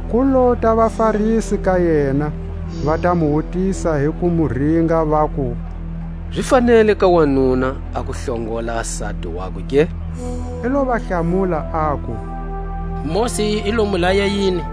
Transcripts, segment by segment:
Ku lota vaFarisi ka yena, va ta mu wutisa hi ku mu ringa, vaku: Zi fanele ka wanuna a ku hlongola sati wakwe ke? I lo va hlamula, aku: Mosi i lo mu laya yini?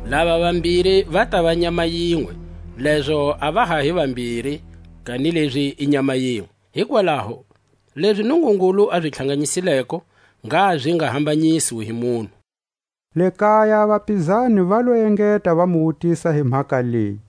Lava vambiri va tava nyama yinwe, lezo a va ha hi vambiri, kanilezi i nyama yinwe. Hikwalaho lezi Nungungulu a zi tlhanganyisileko, ngha zi nga hambanyiswi hi munhu. Le kaya a vapizani va lo engeta va mu wutisa hi mhaka leyi.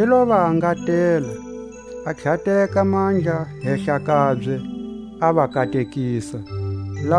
I lo va angatela, a tlhateka mandla hehla kabye, a va katekisa. A jaha gi fumileko.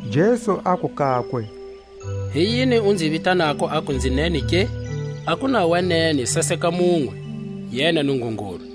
Jesu aku kakwe: Hi yini u nzi vitanako uku nzi nene ke? A ku na wa nene saseka munwe, yena Nungungulu.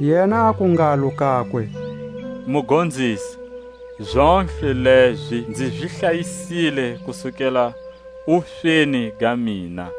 Yena aku ngalo kakwe: Mugonzisi, zontlhe lezi nzi zi hlayisile kusukela wusweni ga mina.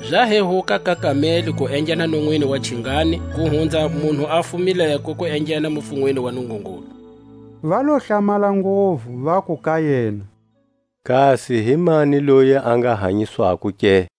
Za hehuka ka kameli ku enghena nonwini wa chingani, ku hunza munhu a fumileko ku enghena mufunweni wa Nungungulu. Va lo hlamala nguvu, vaku ka yena: Kasi himani loyi a nga hanyiswako ke?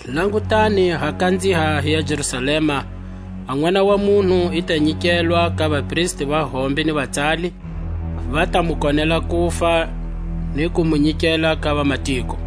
aku: Langutani, ha kanziha hiya Jerusalema; a Nʼwana wa munhu i ta nyikelwa ka vapristi va hombe ni vatsali; va ta mu konela kufa, ni ku mu nyikela ka vamatiko,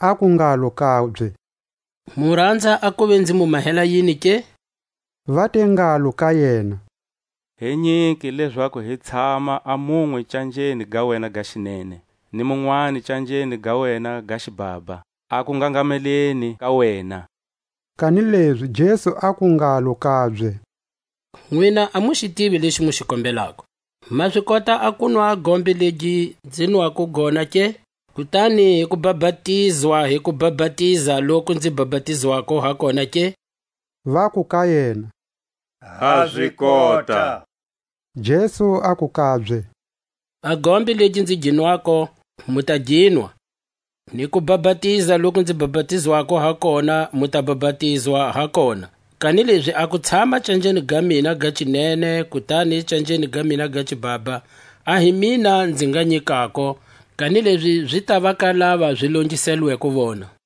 Aku ngalo kabye; Mu ranza a kuva nzi mu mahela yini ke? Va te ngalo ka yena: Hi nyike lezaku hi tshama a munwe canjeni ga wena ga xinene, ni munwani canjeni ga wena ga xibhabha, a kungangameleni ka wena. Kanilezi Jesu aku ngalo kabye: Nwina a mu xi tivi lexi mu xi kombelako. Ma zi kota a kunwa a gombe legi nzi nwako gona ke? kutani ku bapatizwa hi kubapatiza loku nzi bapatizwako ha kona ke? Vaku ka yena: Ha zi kota. Jesu aku kabye: A gombe legi nzi gi nwako, mu ta ginwa; ni kubapatiza loku nzi bapatizwako ha kona mu ta bapatizwa ha kona; kanilezi a ku tshama canjeni ga mina ga xinene, kutani canjeni ga mina ga xibhabha a hi mina nzi nga nyikako, kanilezi zi tava ka lava zi longiselelweko vona.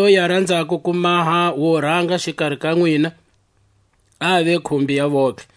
Ni loyi a ranzako ku maha wo ranga xikari ka nwina a ave khumbi ya vontlhe.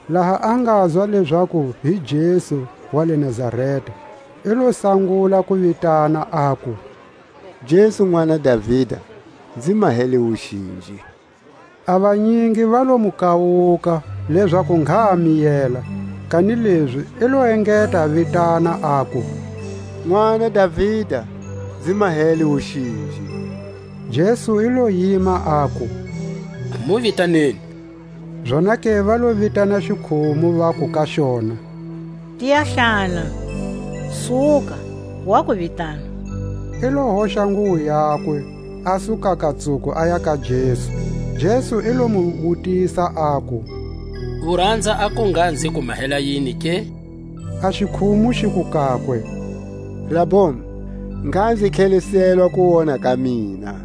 Laha a ngazwa lezaku hi Jesu wa le Nazareta, i lo sangula ku vitana, aku: Jesu Nʼwana Davida, nzi mahele wuxinji! A vanyingi va lo mu kawuka, lezaku ngha a miyela; kanilezi i lo engeta a vitana, aku: Nʼwana Davida, nzi mahele wuxinji! Jesu i lo yima, aku: Mu vitaneni. Zonake va lo vitana xikhumu, vaku ka xona: Tiya hlana; suka, wa ku vitana. I lo hoxa nguwo yakwe, a su kakatsuko, aya ka Jesu. Jesu i lo mu wutisa, aku: U ranza a ku ngha nzi ku mahela yini ke? A xikhumu xiku kakwe: Raboni, ngha nzi tlheliselwa kuwona ka mina.